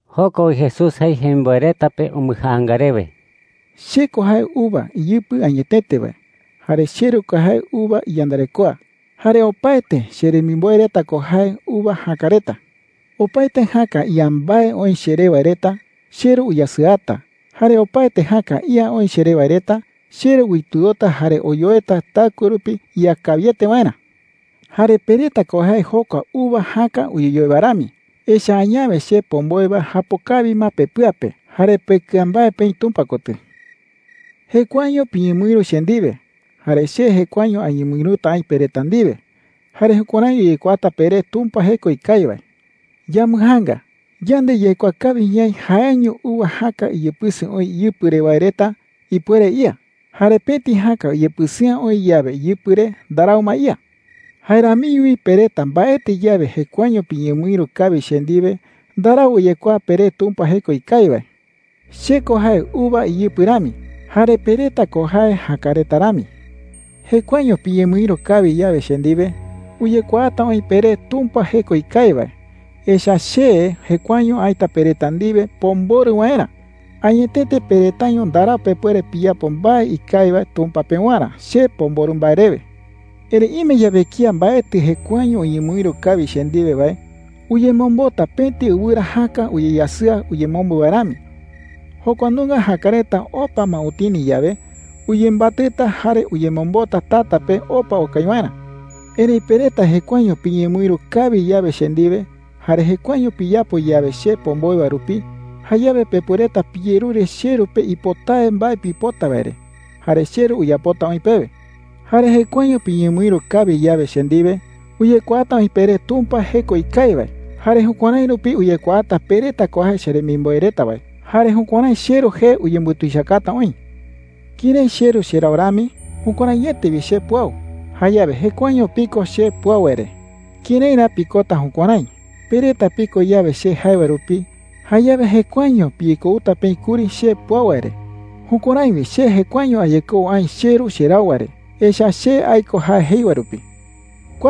Joko wi Jesús jei jemimboe reta pe umbɨjaanga rewe: “Che ko jae uva iyɨpɨ añetete wae. Jare cheRu ko jae uva iyandarekoa. Jare opaete cheremimboe reta ko jae uva jäka reta,” jei chupe reta. “Opaete jäka ía mbae oï cheré wae reta, cheRu uyasɨata. Jare opaete jäka ía oï cheré wae reta, cheRu uitɨota jare oyoeta taɨkue rupi ía kawiete waerä,” jei chupe reta. “Jare pe reta ko jae jokua uva jäka uyeyoe wae rami, echa’ä añawe che pomboe wae japo kawi ma pepɨa pe jare pekɨa mbae peï Tumpa kotɨ,” jei chupe reta. “Jekuaeño piñemɨïru che ndiwe, jare che jekuaeño añemɨïruta aï pe reta ndiwe. Jare jukuärái uyekuaata peré Tumpa jeko ikawi wae,” jei. “Yambɨjaanga. Yande yaikuaa kawi ñaï jaeño uva jäka uyepɨsɨ oï iyɨpɨ re wae reta ipuere ía. Jare pëti jäka uyepɨsɨ'ä oï yawe iyɨpɨ re, ndarau ma ía,” jei. “Jae ramiño wi pe reta mbaetɨ yawe jekuaeño piñemɨïru kawi che ndiwe, ndarau uyekuaa peré Tumpa jeko ikawi wae,” jei chupe reta. “Che ko jae uva iyɨpɨ rami, jare pe reta ko jae jäka reta rami. Jekuaeño piñemɨïru kawi yawe che ndiwe, uyekuaata oï peré Tumpa jeko ikawi wae, echa’ä che jekuaeño aïta pe reta ndiwe pomborɨ waerä. Añetete pe retaiño ndarau pepuere piyapo mbae ikawi wae Tumpa pewarä che pomborɨ mbae rewe,” jei chupe reta. “Erëi ime yawe kía mbaetɨ jekuaeño uñemɨïru kawi che ndiwe wae, uyemombota pëti ɨwɨra jäka uyeyasɨa uyemombo wae rami. Jokua nunga jäka reta opa ma utini yawe, uyembatɨta jare uyemombota tata pe opa okai waerä,” jei chupe reta. “Erëi pe reta jekuaeño piñemɨïru kawi yawe che ndiwe jare jekuaeño piyapo yawe che pomboe wae rupi, jayawe pepuereta piyerure cheRu pe ipotawe mbae pipota wae re, jare cheRu uyapota oï pewe,” jei chupe reta. “Jare jekuaeño piñemɨïru kawi yawe che ndiwe, uyekuaata oï peré Tumpa jeko ikawi wae. Jare jukuärái rupi uyekuaata pe reta ko jae cheremimboe reta wae. Jare jukuärái cheRu jee uyembutuichakata oï,” jei chupe reta. “Kërái cheRu cherau rami, jukuäraiete wi che puau. Jayawe jekuaeño piko che puau wae re. ¿Kërái ra pikota jukuärái? Pe reta piko yawe che jae wae rupi, jayawe jekuaeño piyekouta peï kuri che puau wae re. Jukuärái wi che jekuaeño ayekou aï cheRu cherau wae re, echa’ä che aiko jae jei wae rupi,” jei chupe reta.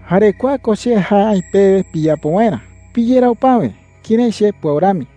“Jare kua ko che jae aï pewe piyapo waerä: piyerau päwe kërái che puau rami.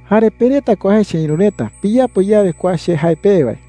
“Jare pe reta ko jae cheïru reta piyapo yawe kua che jae pewe wae.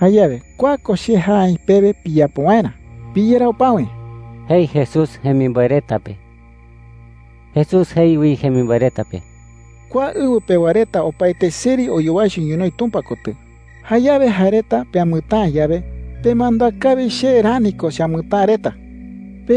“Jayawe kua ko che jae aï pewe piyapo waerä: ¡Piyerau päwe!” jei Jesús jemimboe reta pe. Jesús jei wi jemimboe reta pe: “Kua ɨwɨ pewa reta opaete seri oyowaicho ñonoï Tumpa kotɨ. Jayawe jae reta peamɨtäa yawe, pemandúa kawi che rani ko cheamɨtäa reta,” jei chupe reta.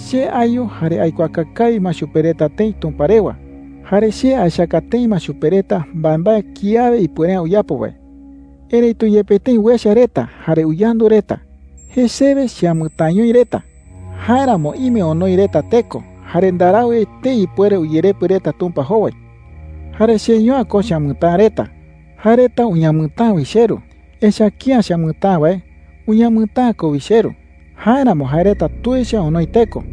“Che ayu jare aikuaaka kawi ma chupe reta tëi Tumpa rewa. Jare che aechaka tëi ma chupe reta mbaembae kiawe ipuere’ä uyapo wae. Erëitu yepe tëi uecha reta jare uyandu reta, jesewe cheamɨtäañoi reta. Jáeramo ime onoi reta teko jare ndarau etei ipuere uyerepɨ reta Tumpa jowai,” jei chupe reta. “Jare cheño’ä ko cheamɨtäa reta. Jae reta uñamɨtäa wi cheRu. Echa’ä kía cheamɨtäa wae, uñamɨtäa ko wi cheRu. Jáeramo jae reta tuicha onoi teko.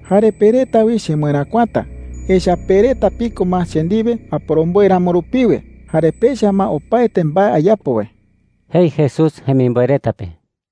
“Jare pe reta wi chemɨeräkuata, echa’ä pe reta piko ma che ndiwe aporomboe ramo rupiwe jare pecha ma opaete mbae ayapo wae,” jei Jesús jemimboe reta pe.